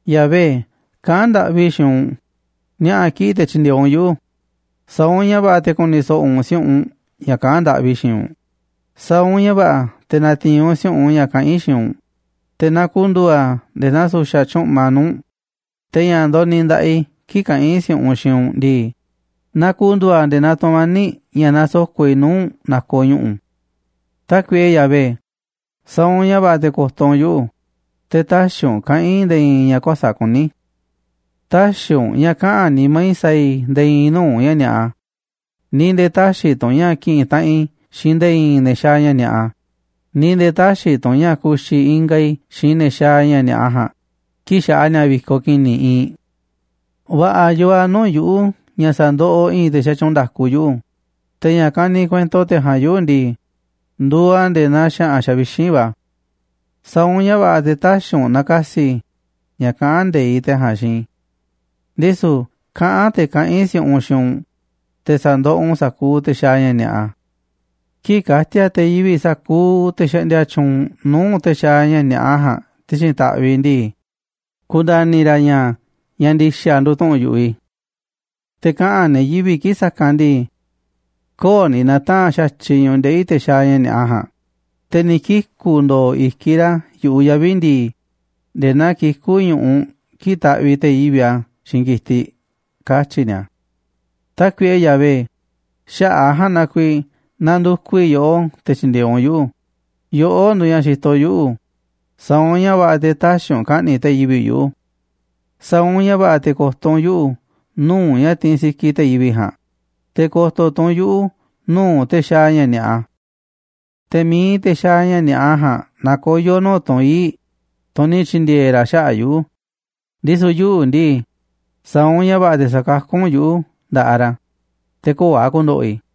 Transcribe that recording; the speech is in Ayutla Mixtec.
Yahvé, kaꞌán ndaꞌvi i̱ xiinꞌ u̱nꞌ, ni̱a̱ꞌa̱ kiꞌi̱ꞌ te̱ tyi̱ndi̱e̱eꞌ u̱nꞌ yuꞌu̱, sa̱a̱ u̱nꞌ ña̱ va̱ꞌa̱ te̱ ku̱ni̱ so̱ꞌo̱ u̱nꞌ si̱u̱ꞌunꞌ ña̱ kaꞌán ndaꞌvi i̱ xiinꞌ u̱nꞌ. Sa̱a̱ u̱nꞌ ña̱ va̱ꞌa̱ te̱ na̱ti̱i̱n u̱nꞌ si̱u̱ꞌunꞌ ña̱ kaꞌán i̱ xiinꞌ u̱nꞌ, te̱ na ku̱ndu̱u̱ a̱ nde̱e̱ naa su̱xa̱ tyúꞌma nuu̱ꞌ u̱nꞌ, te̱ ña̱ ndoniꞌiꞌ i̱ nda̱ꞌaꞌ i̱ kii̱ꞌ kaꞌán i̱ si̱u̱ꞌunꞌ xiinꞌ u̱nꞌ ndii, na ku̱ndu̱u̱ a̱ nde̱e̱ naa tu̱mani̱ꞌ ña̱ nasoko̱ꞌ i̱ nuu̱ꞌ u̱nꞌ nakoꞌ ñu̱ꞌu̱. Tákuiꞌe Yahvé, sa̱a̱ u̱nꞌ ña̱ va̱ꞌa̱ te̱ ko̱to̱ u̱nꞌ yu̱ꞌuꞌ, te̱ tä̱xi̱ u̱nꞌ kaꞌa̱n i̱ nde̱e̱ i̱i̱n ña̱ kuäsa̱ꞌ kuní. Tä̱xi̱ u̱nꞌ ña̱ kaꞌa̱n nimá i̱ sa̱a̱ i̱ nde̱e̱ i̱i̱n nuu̱ꞌ ña̱ ni̱a̱ꞌa, ni̱ nde̱e̱ tä̱xi̱ tu̱ u̱nꞌ ña̱ ki̱ꞌi̱n taꞌanꞌ i̱ xiinꞌ nde̱e̱ i̱i̱n ne̱ xaaꞌ ña̱ ni̱a̱ꞌa, ni̱ nde̱e̱ tä̱xi̱ tu̱ u̱nꞌ ña̱ ku̱xi̱ ingaꞌ i̱ xiinꞌ ne̱ xaaꞌ ña̱ ni̱a̱ꞌa ja̱a̱nꞌ kii̱ꞌ xaꞌa ni̱a̱ vi̱koꞌ ki̱ni̱ iinꞌ. Va̱ꞌa̱ yoo a̱ nuu̱ꞌ yuꞌu̱ ña̱ sa̱ndoꞌoꞌ i̱i̱n te̱ xatyuunꞌ nda̱ku yuꞌu̱, te̱ ña̱ kaniꞌ kuento te̱ ja̱a̱nꞌ yuꞌu̱ ndii, nduuꞌ a̱ nde̱e̱ naa xa̱ꞌa̱n xavixínꞌ va̱. Sa̱a̱ u̱nꞌ ña̱ va̱ꞌa̱ te̱ tä̱xi̱ u̱nꞌ na̱ka̱si̱ i̱ ña̱ kaꞌán nde̱iꞌ te̱ ja̱a̱nꞌ xiinꞌ i̱. Ndisu̱ kaꞌán te̱ kaꞌán i̱ si̱u̱ꞌunꞌ xiinꞌ u̱nꞌ, te̱ sa̱ndoꞌoꞌ u̱nꞌ sa̱kuuꞌ te̱ xaaꞌ ña̱ ni̱a̱ꞌa. Kii̱ꞌ ka̱ti̱a̱ te̱ yivi̱ꞌ sa̱kuuꞌ te̱ xaꞌndia tyuunꞌ nuu̱ꞌ te̱ xaaꞌ ña̱ ni̱a̱ꞌa ja̱a̱nꞌ ti̱xi̱n ta̱ꞌviꞌ ndii, ku̱nda̱ni̱ ra̱ ña̱ ña̱ ndi̱xa̱ nduuꞌ tu̱ꞌu̱n yuꞌu̱ i̱. Te̱ kaꞌa̱n ne̱ yivi̱ꞌ kii̱ꞌ sa̱kanꞌ ndii: “Köo̱ꞌ ni̱ na̱taa̱nꞌ xa̱tyiꞌ ñu̱ꞌuꞌ ndeꞌi̱ te̱ xaaꞌ ña̱ ni̱a̱ꞌa ja̱a̱nꞌ, te̱ ni̱ kiku̱ ndo̱o̱ i̱kiꞌ ra̱ yu̱ꞌuꞌ yavi̱ ndi̱i̱, nde̱e̱ naa kikú ñu̱ꞌuꞌ kii̱ꞌ taꞌviꞌ te̱ yivi̱ꞌ a̱ xiinꞌ ki̱tiꞌ”, katyi̱ ni̱a̱. Tákuiꞌe Yahvé, xaꞌa̱ꞌ a̱ ja̱a̱nꞌ na kuiiꞌ nandukuꞌ i̱ yoꞌó te̱ tyi̱ndi̱e̱eꞌ u̱nꞌ yuꞌu̱. Yoꞌó nduuꞌ ña̱ xitoꞌ yuꞌu̱, sa̱a̱ u̱nꞌ ña̱ va̱ꞌa̱ te̱ tä̱xi̱ u̱nꞌ ka̱ꞌni̱ꞌ te̱ yivi̱ꞌ yuꞌu̱. Sa̱a̱ u̱nꞌ ña̱ va̱ꞌa̱ te̱ ko̱to̱ u̱nꞌ yuꞌu̱ nuu̱ꞌ ña̱ tiinꞌ sikiꞌ te̱ yivi̱ꞌ ja̱a̱nꞌ, te̱ ko̱to̱ tu̱ u̱nꞌ yuꞌu̱ nuu̱ꞌ te̱ xaaꞌ ña̱ ni̱a̱ꞌa. Te̱ mi̱iꞌ te̱ xaaꞌ ña̱ ni̱a̱ꞌa ja̱a̱nꞌ na koyo̱ nuu̱ꞌ tunꞌ ii̱ꞌ, tunꞌ ni̱ tyi̱ndi̱e̱e̱ ra̱ xaꞌa̱ꞌ yuꞌu̱, ndisu̱ yuꞌu̱ ndii, sa̱a̱ u̱nꞌ ña̱ va̱ꞌa̱ te̱ sa̱kakú u̱nꞌ yuꞌu̱ nda̱ꞌaꞌ ra̱, te̱ köo̱ꞌ a̱ ku̱ndo̱ꞌo̱ i̱.